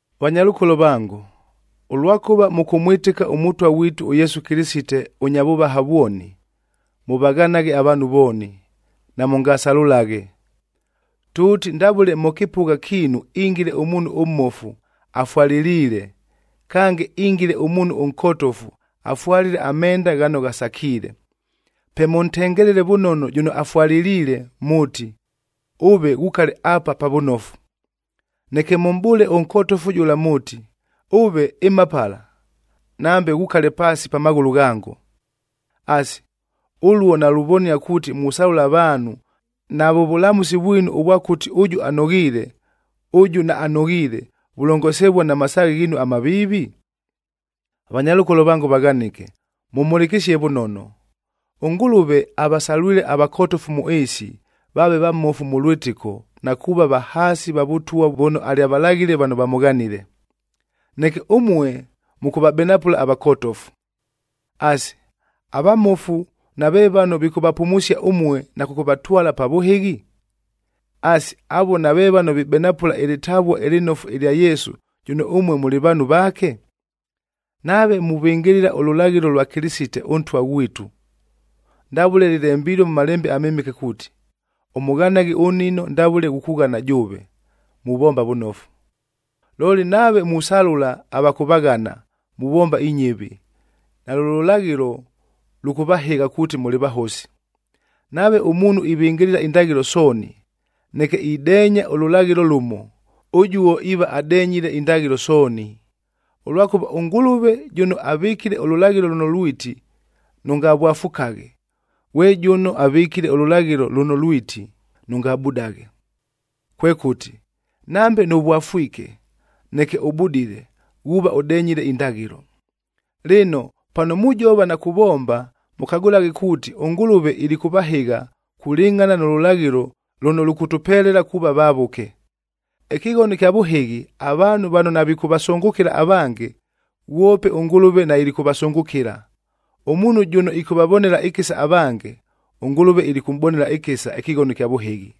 Vanyalʉkolo vango, ʉlwakʉva mʉkʉmwɨtɨka ʉMʉtwa ghwitu ʉYesu Kɨlɨsite ʉnya vʉvaha vwoni, mʉvaghanaghe avaanhu vooni, namʉngasalʉlaghe. Tʉʉti ndavʉle mʉ kɨpʉgha kiinu ingiile ʉmuunhu ʉmmofu afwalɨliile, kange ingiile ʉmuunhu ʉnkotofu afwalile amenda ghano ghasakiile, pe mʉntengelele vʉnono jʉno afwalɨliile mʉʉti, “Ʉve ghukale apa pa vʉnofu.” Neke mʉmʼbʉʉle ʉnkotofu jʉla mʉʉti, “Ʉve, ɨma pala, nambe ghukale paasi pa maghʉlʉ ghango.” Asi, ʉluo naluvonia kuuti musalʉla avaanhu, navʉ vʉlamʉsi vwinu ʉvwa kuuti ʉjʉ anoghiile, ʉjʉ naanoghiile, vulongosivua na masaaghe ghiinu amaviivi? Vanyalʉkolo vango vaghanɨke, mʉmhʉlɨkɨsie vʉnono. ɄNgʉlʉve avasalwile avakotofu mʉ ɨɨsi, vaave vamofu mʉ lwɨtɨko na kuuva vahaasi va Vʉtwa vʉno alyavalaghile vano vamʉghanile. Neke ʉmue mʉkʉvabenapʉla avakotofu. Asi, avamofu nave vano vikʉvapumusia ʉmue na kʉkʉvatwala pa vʉhɨghi? Asi, avuo nave vano vibenapʉla ɨlɨtavua ɨlɨnofu ɨlya Yesu, jʉno ʉmue mʉlɨ vaanhu vaake? Nave muvɨngɨlɨla ʉlʉlaghɨlo lwa Kɨlɨsite ʉNtwa ghwitu ndavʉle lɨlembilue mʉ Malembe aMɨmɨke kuuti, “Ʉmʉghanaghe ʉnnino ndavʉle ghukughana jʉʉve,”a muvomba vʉnofu. Looli, nave musalʉla ava kʉvaghana, muvomba inyɨvi, nalʉ lʉlaghɨlo lʉkʉvahɨgha kuuti mʉlɨ vahosi. Nave ʉmuunhu ivɨngɨlɨla indaghɨlo sooni, neke ideenya ʉlʉlaghɨlo lʉmo, ʉjuo iiva adenyile indaghɨlo sooni. Ʉlwakʉva ʉNgʉlʉve jʉno avɨkile ʉlʉlaghɨlo lʉno lwiti, “Nʉngavwafukaghe,”b ghwe jʉno avɨkile ʉlʉlaghɨlo lʉno lwiti, “Nʉngabudaghe.”c Kwekʉti, nambe nʉvwafwike, neke ʉbudile, ghuuva ʉdenyile indaghɨlo. Lɨno, pano mujova na kuvomba, mʉkagʉlaghe kuuti, ʉNgʉlʉve ilikʉvahɨgha kulɨngʼhana nʉ lʉlaghɨlo lʉno lʉkʉtʉpelela kuuva vavʉke. Ɨkɨghono ɨkya vʉhɨghi, avaanhu vano navikʉvasʉngʉkɨla avange, ghwope ʉNgʉlʉve nailikʉvasʉngʉkɨla. Ʉmuunhu jʉno ɨkʉvavonela ɨkɨsa avange, ʉNgʉlʉve ilikʉmʼbonela ɨkɨsa ɨkɨghono ɨkya vʉhɨghi.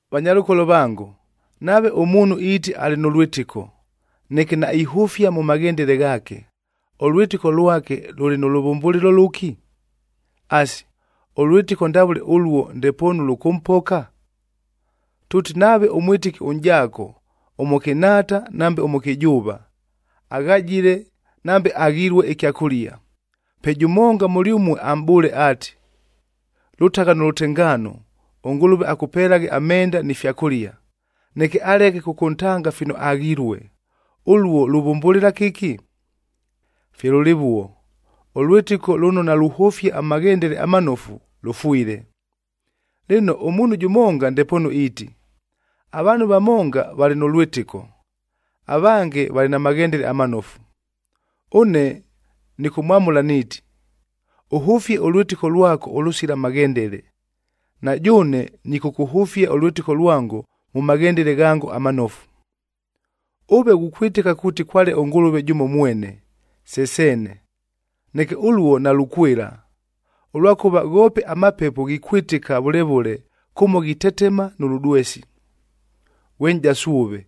Vanyalʉkolo vango, nave ʉmuunhu iiti alɨ nʉ lwɨtɨko, neke naihʉfia mʉ maghendele ghaake, ʉlwɨtɨko lwake lʉlɨ nʉ lʉvʉmbʉlɨlo lʉki? Asi, ʉlwɨtɨko ndavʉle ʉluo ndepoonu lʉkʉmpoka? Tʉʉti nave ʉmwɨtɨki ʉnʼjaako, ʉmʉkɨnhaata nambe ʉmʉkɨjʉʉva, aghajile nambe aghilue ɨkyakʉlia, pe jʉmonga mʉlyʉmue amʼbʉʉle ati, “Lʉtagha nʉ lʉtengaano, ʉNgʉlʉve akʉpelaghe amenda ni fyakʉlia,” neke aleke kʉkʉntanga fino aghilue, ʉluo luvʉmbʉlɨla kɨki? Fye lʉlɨvuo, ʉlwɨtɨko lʉno naluhʉfia amaghendele amanofu, lʉfwile. Lɨno, ʉmuunhu jʉmonga ndepoonu iiti, “Avaanhu vamonga valɨ nʉ lwɨtɨko, avange valɨ na maghendele amanofu.” Ʉne nɨkʉmwamʉla niiti, “Ʉhʉfie ʉlwɨtɨko lwako ʉlʉsila maghendele, na jʉʉne nɨkʉkʉhʉfia ʉlwɨtɨko lwango mʉ maghendele ghango amanofu.” Ʉve ghukwɨtɨka kuuti kwale ʉNgʉlʉve jʉmo mwene, se seene. Neke ʉluo nalukwɨla, ʉlwakʉva ghoope amapepo ghikwɨtɨka vʉle vʉle kʉmo ghitetema nʉ lʉdwesi. Ghwe nʼjasu ʉve!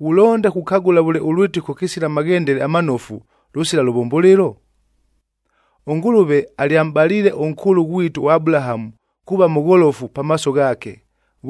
Ghulonda kukagʉla vʉle ʉlwɨtɨko kɨsila maghendele amanofu, lʉsila lʉvʉmbʉlɨlo? ɄNgʉlʉve alyamʼbaliile ʉnkʉʉlʉ ghwitu ʉAbulahamu kuuva mʉgholofu pamaaso ghaake,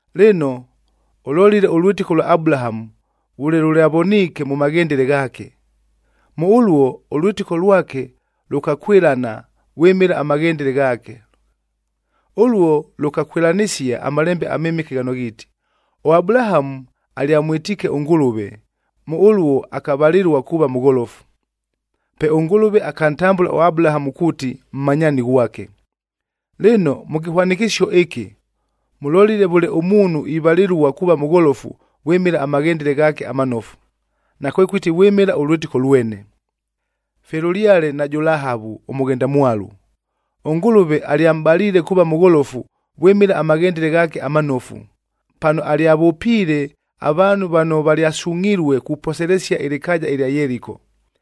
Lɨno ʉlolile ʉlwɨtɨko ʉlwa Abulahamu, vʉle lʉlyavoniike mʉ maghendele ghaake. Mʉ ʉluo, ʉlwɨtɨko lwake lʉkakwɨlana vwɨmɨla amaghendele ghaake. Ʉluo lʉkakwɨlanɨsia aMalembe aMɨmɨke ghano ghiiti, “ɄAbulahamu alyamwɨtiike ʉNgʉlʉve, mʉ ʉluo akavalɨlua kuuva mʉgholofu.”e Pe ʉNgʉlʉve akantambʉla ʉAbulahamu kuuti mmanyaani ghwake. Lɨno mʉ kɨhwanɨkɨsio ɨkɨ, mʉlolile vʉle ʉmuunhu ivalɨlua kuuva mʉgholofu vwɨmɨla amaghendele ghaake amanofu, nakwekʉti vwɨmɨla ʉlwɨtɨko lwene. Fye lʉlyale najʉ Lahavu ʉmʉghendamwalu, ʉNgʉlʉve alyamʼbaliile kuuva mʉgholofu vwɨmɨla amaghendele ghaake amanofu, pano alyavʉpiile avaanhu vano valyasungʼhilue kuposelesia ɨlɨkaaja ɨlya Yeliko.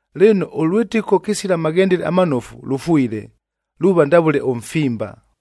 Lɨno, ʉlwɨtɨko kɨsila maghendele amanofu, lʉfwile. Luuva ndavʉle ʉmfimba.